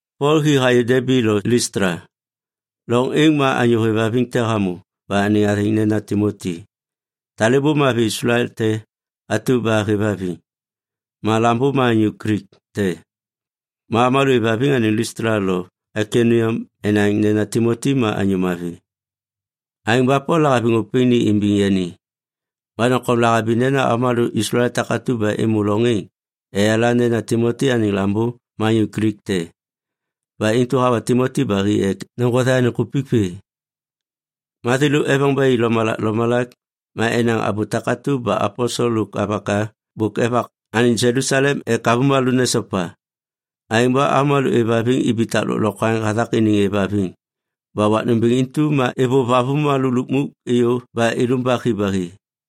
Pol hi hayô Debi lo Listla. Loŋ êŋ ma anyô hêvhaviŋ te hamô ba anêŋ athêŋ nena Timoti. Talêbô ma avi Islael te atu ba hêvhaviŋ. Ma lambô ma anyô Glik te. Ma avômalô êvhaviŋ anêŋ Listla lo Aikoniam enaŋ nena Timoti ma anyô mavi. Aêŋ ba Pol lahaviŋ ôpêŋ ni imbiŋ yani. Ma doŋtom lahabi nena avômalô Islael takatu ba êmô loŋ êŋ eyala nena Timoti anêŋ lambô ma anyô Glik te. Ba intu hawa Timoti ba hi ek neŋgothe anêŋ kupik vê. Ma thêlô eveŋ ba i lomalak lomalak ma enaŋ abô takatu ba aposel lôk avaka bôk evak anêŋ Jelusalem ek avômalô nesopa. Aêŋ ba avômalô êvhaviŋ ibitak lôklokwaŋ hathak iniŋ êvhaviŋ ba wak nômbêŋ intu ma êvôv avômalô lukmuk êyô ba ilumbak hi ba hi.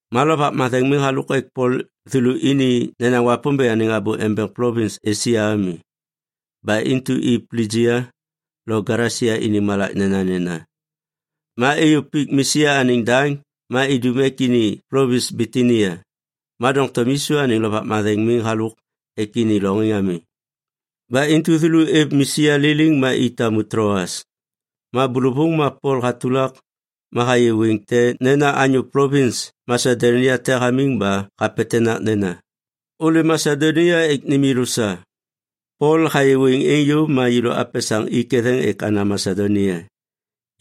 Ma Lovak Matheŋ miŋ halôk ek Pol thêlô ini nenaŋ Wapômbêŋ anêŋ abô embeŋ plovins Esia ami. Ba intu i Plijia lo Galesia iniŋ malak nenanena. Ma êyô pik Misia anêŋ daŋ ma idum ek ini plovins Bitinia, ma doŋtom Yisu anêŋ Lovak Matheŋ miŋ halôk ek ini loŋ êŋ ami. Ba intu thêlô êv Misia liliŋ ma i tamu Tloas. Ma bôlôvôŋ ma Pol hatulak ma hayê wêŋ te nena anyô plovins Masedonia te hamiŋ ma hapetenak nena, “Ôlêm Masedonia ek nêm yêlô sa.” Pol hayê wêŋ êŋ yôv ma yêlô apesaŋ i ketheŋ ek ana Masedonia.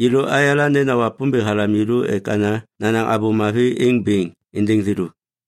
Yêlô ayala nena Wapômbêŋ halam yêlô ek ana nanaŋ Abô Mavi êŋ bêŋ êndêŋ thêlô.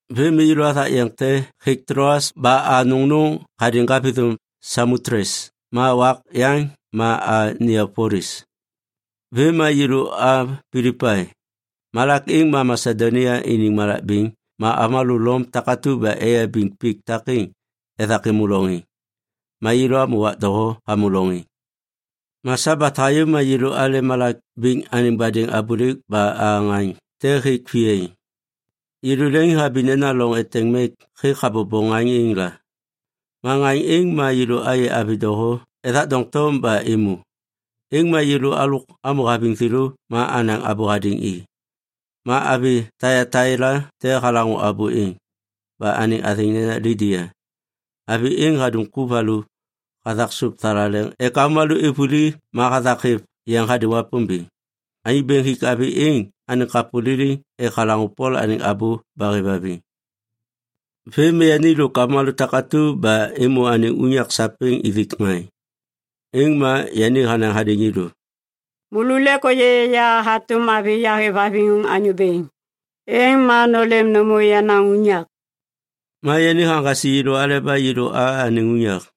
Vêm ma yêlô athak yeŋ te hêk Tloas ba a nôŋnôŋ hadêŋ ŋgavithôm Samotles ma wak yaŋ ma a Niapolis. Vêm ma yêlô a Pilipai. Malak êŋ ma Masedonia iniŋ malak bêŋ ma avômalô Lom takatu ba eyabiŋ pik takêŋ ethak êmô loŋ êŋ. Ma yêlô amô wak doho hamô loŋ êŋ. Ma Sabat hayô ma yêlô ale malak bêŋ anêŋ badêŋ abôlêk ba a ŋaŋ te hêk viyaiŋ. Yêlô leŋiŋhabi nena loŋ eteŋ mek hêk habobo ŋaŋ êŋ la. Ma ŋaŋ êŋ ma yêlô ayê avi doho ethak doŋtom ba êmô. Êŋ ma yêlô alôk amô haviŋ thêlô ma anaŋ abô hadêŋ i. Ma avi Taiataila te halaŋô abô êŋ, ba anêŋ athêŋ nena Lidia. Avi êŋ hadum ku valu hathak sôp thalaleŋ ek avômalô êv vuli ma hathak hêv yeŋ hadêŋ Wapômbêŋ. Anyô Bêŋ hik avi êŋ anêŋ kapô liliŋ ek halaŋô Pol anêŋ abô ba hêvhaviŋ. Vêm ma yani lôk avômalô takatu ba êmô anêŋ unyak sapêŋ ithik ŋaŋ. Êŋ ma yani hanaŋ hadêŋ yêlô, “Môlô lêk ôyê ya hatôm avi yahêvhaviŋ Anyô Bêŋ, êŋ ma nôlêm nômô yenaŋ unyak.” Ma yani haŋgasi yêlô aleba yêlô a anêŋ unyak.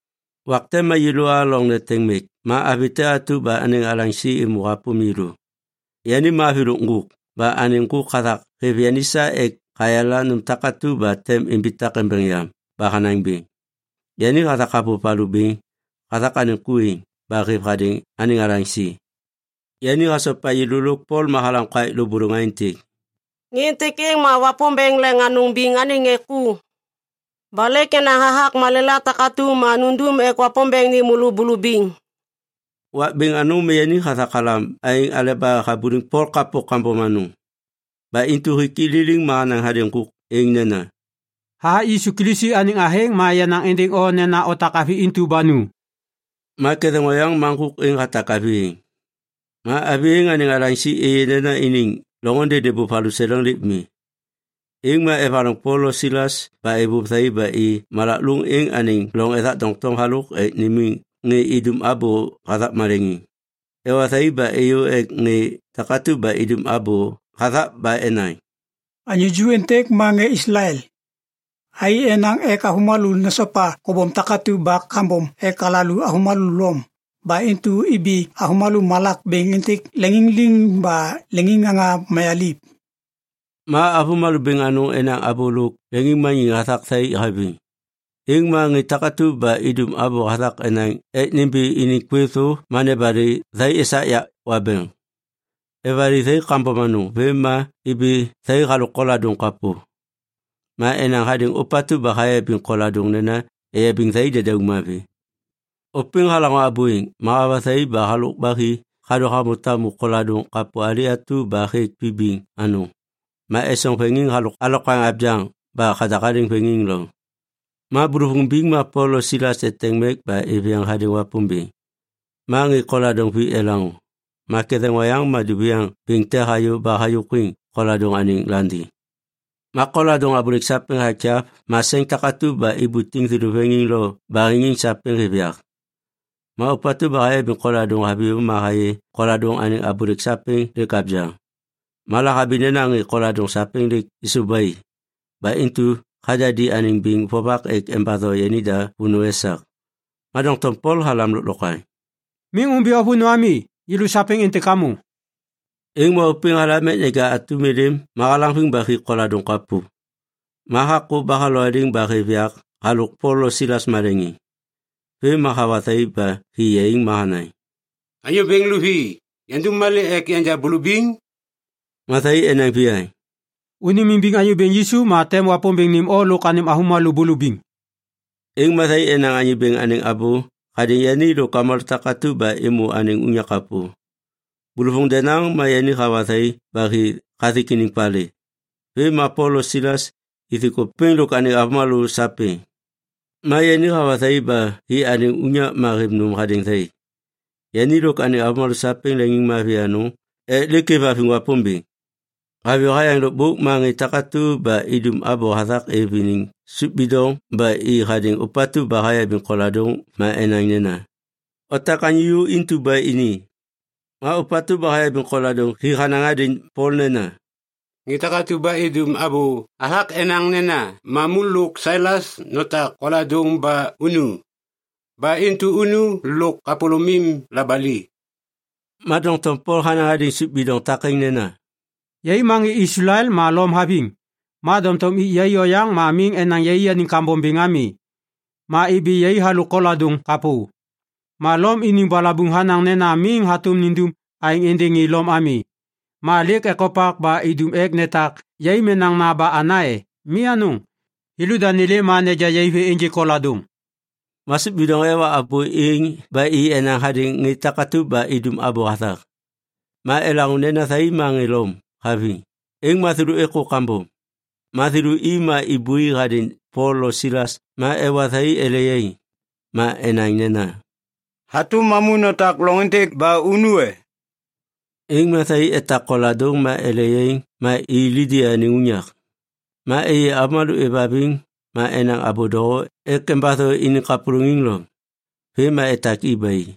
Wak te ma yêlô a loŋ neteŋ mek ma avi te atu ba anêŋ alaŋsi êmô hapôm yêlô. Yani ma avi lôk ŋgôk ba anêŋ ŋgôk hathak hêv yani sa ek hayala nôm takatu ba tem imbitak embeŋ yam ba hanaŋ bêŋ. Yani hathak havôv valu bêŋ hathak anêŋ ku êŋ ba hêv hadêŋ anêŋ alaŋsi. Yani hasopa yêlô lôk Pol ma halam kaêk lôbôlôŋ aêntêk, “Ŋê êntêk êŋ ma Wapômbêŋ Leŋ Anôŋ Biŋ anêŋ ŋê ku. Ba lêk enaŋ hathak malêla takatu ma nundum ek Wapômbêŋ nêm môlô bulubiŋ.” Wak bêŋ anôŋ ma yani hathak halam aêŋ aleba habuliŋ Pol kapô kambom anôŋ. Ba intu hik i liliŋ ma hanaŋ hadêŋ ŋgôk êŋ nena, “Hathak Yisu Kilisi anêŋ athêŋ ma yanaŋ êndêŋ o nena otak avi intu ba nu!” Ma ketheŋ oyaŋ ma ŋgôk êŋ hatak avi êŋ. Ma avi êŋ anêŋ alaŋsi êyê nena iniŋ loŋôndê nêbôv valuseleŋ lêk mi, êŋ ma evaloŋ Pol lo Silas ba êvôv thai ba i malak lôŋ êŋ anêŋ loŋ ethak doŋtom halôk ek nimiŋ ŋê idum abô hathak maleŋiŋ. Ewa thai ba êyô ek ŋê takatu ba idum abô hathak ba enaŋ, “Anyô ju êntêk ma ŋê Islael. Thai enaŋ ek avômalô nesopa kobom takatu ba kambom ek alalô avômalô Lom. Ba intu ibi avômalô malak bêŋ êntêk leŋiŋ liŋ ba leŋiŋŋaŋa mayaliv.” Ma avômalô bêŋ anôŋ enaŋ abô lôk leŋiŋmaniŋ hathak thai haviŋ. Êŋ ma ŋê takatu ba idum abô hathak enaŋ ek nimbi iniŋ kwêv thô ma nebali thai esak yak wabeŋ. Evali thai kambom anôŋ vêm ma ibi thai halôk koladôŋ kapô. Ma enaŋ hadêŋ ôpatu ba hayabiŋ koladôŋ nena eyabiŋ thai dedauŋ mavi. Ôpêŋ halaŋô abô êŋ, ma hawa thai ba halôk ba hi hadô hamô tamu koladôŋ kapô ali atu ba hêk vibiŋ anôŋ ma esoŋ veŋiŋ halôk alokwaŋ abyaŋ ba hadahaliŋ veŋiŋ loŋ. Ma bôlôvôŋ biŋ ma Pol lo Silas eteŋ mek ba êv yeŋ hadêŋ Wapômbêŋ, ma ŋê koladôŋ vi elaŋô. Ma ketheŋ oyaŋ ma duviaŋ bêŋ te hayô ba hayôkwiŋ koladôŋ anêŋ landiŋ. Ma koladôŋ abôlêk sapêŋ hakyav ma seŋ takatu ba ibutiŋ thêlô veŋiŋ lo baheŋiŋ sapêŋ hêv yak. Ma ôpatu ba hayabiŋ koladôŋ haviyô ma hayê koladôŋ anêŋ abôlêk sapêŋ lêk abyaŋ. Ma lahabi nena ŋê koladôŋ sapêŋ lêk êsôv ba i, ba intu hadadi anêŋ biŋ vovak ek embatho yanida vônô esak. Ma doŋtom Pol halam lôklokwaŋ, “Miŋ ômbi o vônô ami! Yêlô sapêŋ êntêk amô!” Êŋ ma ôpêŋ halam ek neja atum êlêm ma halaŋviŋ ba hi koladôŋ kapô, ma hakô ba halowaliŋ ba hêv yak halôk Pol lo Silas maleŋiŋ. Vêm ma hawa thai ba hi yaiŋ ma hanaŋ, “Anyô bêŋ luvi, yandum malê ek yanja bulubiŋ?” Ma thai enaŋ viyaŋ, “Ônêmimbiŋ Anyô Bêŋ Yisu ma tem Wapômbêŋ nêm o lôk anêm avômalô bulubiŋ.” Êŋ ma thai enaŋ Anyô Bêŋ anêŋ abô hadêŋ yani lôk avômalô takatu ba êmô anêŋ unyak kapô. Bôlôvôŋ denaŋ ma yani hawa thai ba hi hathik iniŋ palê. Vêm ma Pol lo Silas ithik ôpêŋ lôk anêŋ avômalô sapêŋ. Ma yani hawa thai ba hi anêŋ unyak ma hêv nôm hadêŋ thai. Yani lôk anêŋ avômalô sapêŋ leŋiŋmavi anôŋ ek lêk êvhaviŋ Wapômbêŋ. Haviyô hayaŋ lôkbôk ma ŋê takatu ba idum abô hathak êv iniŋ sôp bidoŋ ba i hadêŋ ôpatu ba hayabiŋ koladôŋ ma enaŋ nena, “Otak anyô ju intu ba ini.” Ma ôpatu ba hayabiŋ koladôŋ hi hanaŋ hadêŋ Pol nena, “Ŋê takatu ba idum abô hathak enaŋ nena mamu lôk Silas notak koladôŋ ba unu. Ba intu unu lôk kapôlômim labali.” Ma doŋtom Pol hanaŋ hadêŋ sôp bidoŋ takêŋ nena, “Yai ma ŋê Islael ma Lom haviŋ. Ma doŋtom ik yai oyaŋ ma miŋ enaŋ yaianiŋ kambom bêŋ ami. Ma ibi yai halôk koladôŋ kapô. Ma Lom iniŋ balabuŋ hanaŋ nena miŋ hatôm nindum aêŋ êndêŋ ŋê Lom ami. Ma lêk ekopak ba idum ek netak yai menaŋna ba ana e? Mi anôŋ! Thêlôda nêlêm ma neja yai vê ênjêk koladôŋ.” Ma sôp bidoŋ ewa abô êŋ ba i enaŋ hadêŋ ŋê takatu ba idum abô hathak. Ma elaŋô nena thai ma ŋê Lom haviŋ, êŋ ma thêlô êkô kambom. Ma thêlô i ma ibui hadêŋ Pol lo Silas ma ewa thai ele yaiŋ. Ma enaŋ nena, “Hatôm mamu notak loŋ êntêk ba unu e?” Êŋ ma thai etak koladôŋ ma ele yaiŋ ma i Lidia anêŋ unyak. Ma êyê avômalô êvhaviŋ ma enaŋ abô doho ek embatho iniŋ kapôlôŋiŋ loŋ. Vêm ma etak i ba i.